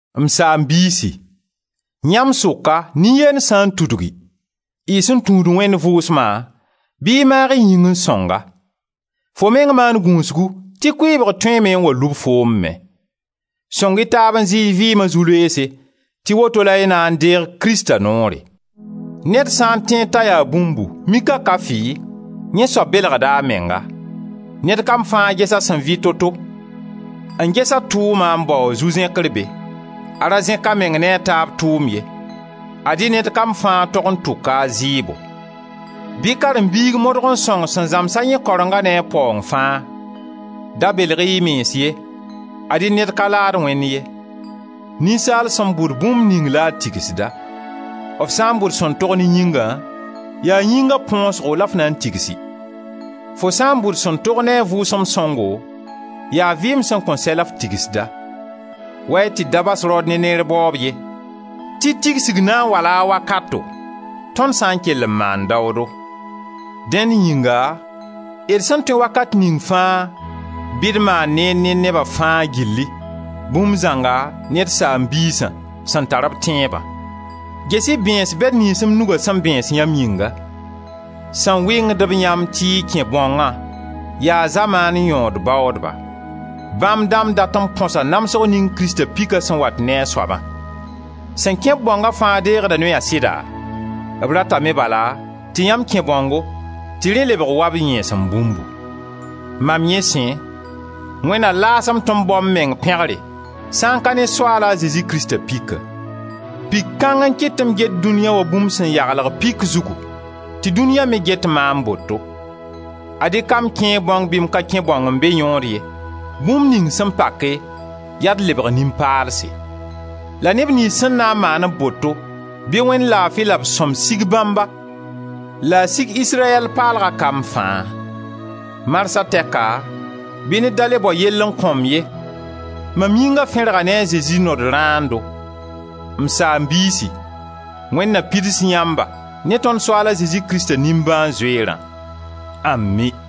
M saam-biisi, yãmb sʋka nin-yend sã n tudgi, y sẽn tũud Wẽnd Vʋʋsma, bɩ y maag y yĩng n sõng-a. Fo meng maan gũusgu tɩ kʋɩɩbg tõeeme n wa lub foom me. Sõng-y taab n zɩ y vɩɩma zu-loeese tɩ woto la y na n deeg Krista noore. Ned sã n tẽed t'a yaa bũmbu, mik a ka fɩ, yẽ soab belgda a menga. Ned kam fãa ges a sẽn vɩ to-to, a ges a tʋʋma n bao a zu-zẽkre be, a ra zẽka meng ne a taab tʋʋm ye. Ad-y ned kam fãa tog n tʋka a zɩɩbo. Bɩ karen-biig modg n sõng sẽn zãmsa yẽ karengã ne a paoong fãa. Da belg-y y mens ye; ad-y ned ka laad Wẽnd ye. Ninsaal sẽn bʋd bũmb ning la a tigsda. F sã n bʋd sẽn tog ne yĩngã, yaa yĩnga põosgo la f na n tigsi. Fo sã n bʋd sẽn tog ne a Vʋʋsem Sõngo, yaa vɩɩm sẽn kõn sɛ la f tigsda. Wa-y tɩ d da bas raood ne neer baoob ye, tɩ tigsg na n wala a wakato, tõnd sã n kell n maan daoodo. Dẽnd yĩnga, d sẽn tõe wakat ning fãa, bɩ d maan neer ne neba fãa gilli, bũmb zãnga ne d saam-biisã, sẽn tar d tẽebã. Ges-y bẽes bɛd niyns m nuga sẽn bẽes yãmb yĩnga. Sẽn wɩngd-b yãmb tɩ y kẽ bãongã, yaa zamaan yõod baoodba. Bãmb dãmb dat n põsa namsg ning Krista pika sẽn wat ne a soabã. Sẽn kẽ-b bãonga fãa deegda noya sɩda? B ratame bala tɩ yãmb kẽ bãongo tɩ rẽ lebg wa b yẽesem bũmbu. Mam yẽ sẽ, Wẽnd na laas-m tɩ m bao m meng pẽgre sã n ka ne Soaal a Zezi Krista pika: pik kãng n kɩt tɩ m get dũniya wa bũmb sẽn yaglg pik zugu tɩ dũniya me get maam boto. Ad-y ka m-kẽe-bãong bɩ m ka kẽ bãong n be yõod ye, bũmb ning sẽn pake, yaa d lebg nin-paalse. La neb niyns sẽn na n maan-b boto, bɩ Wẽnd laafi la b sõm sig bãmba la a sig Israyɛl paalga kamb fãa. Marsã tɛka bɩ ned da le bao yelle n kõ-m ye! Mam yĩnga fẽrga ne a Zezi nodãando. M saam-biisi, Wẽnd na pids yãmba ne tõnd Soaal a Zezi Krista nimbãan-zoeerã! Ami!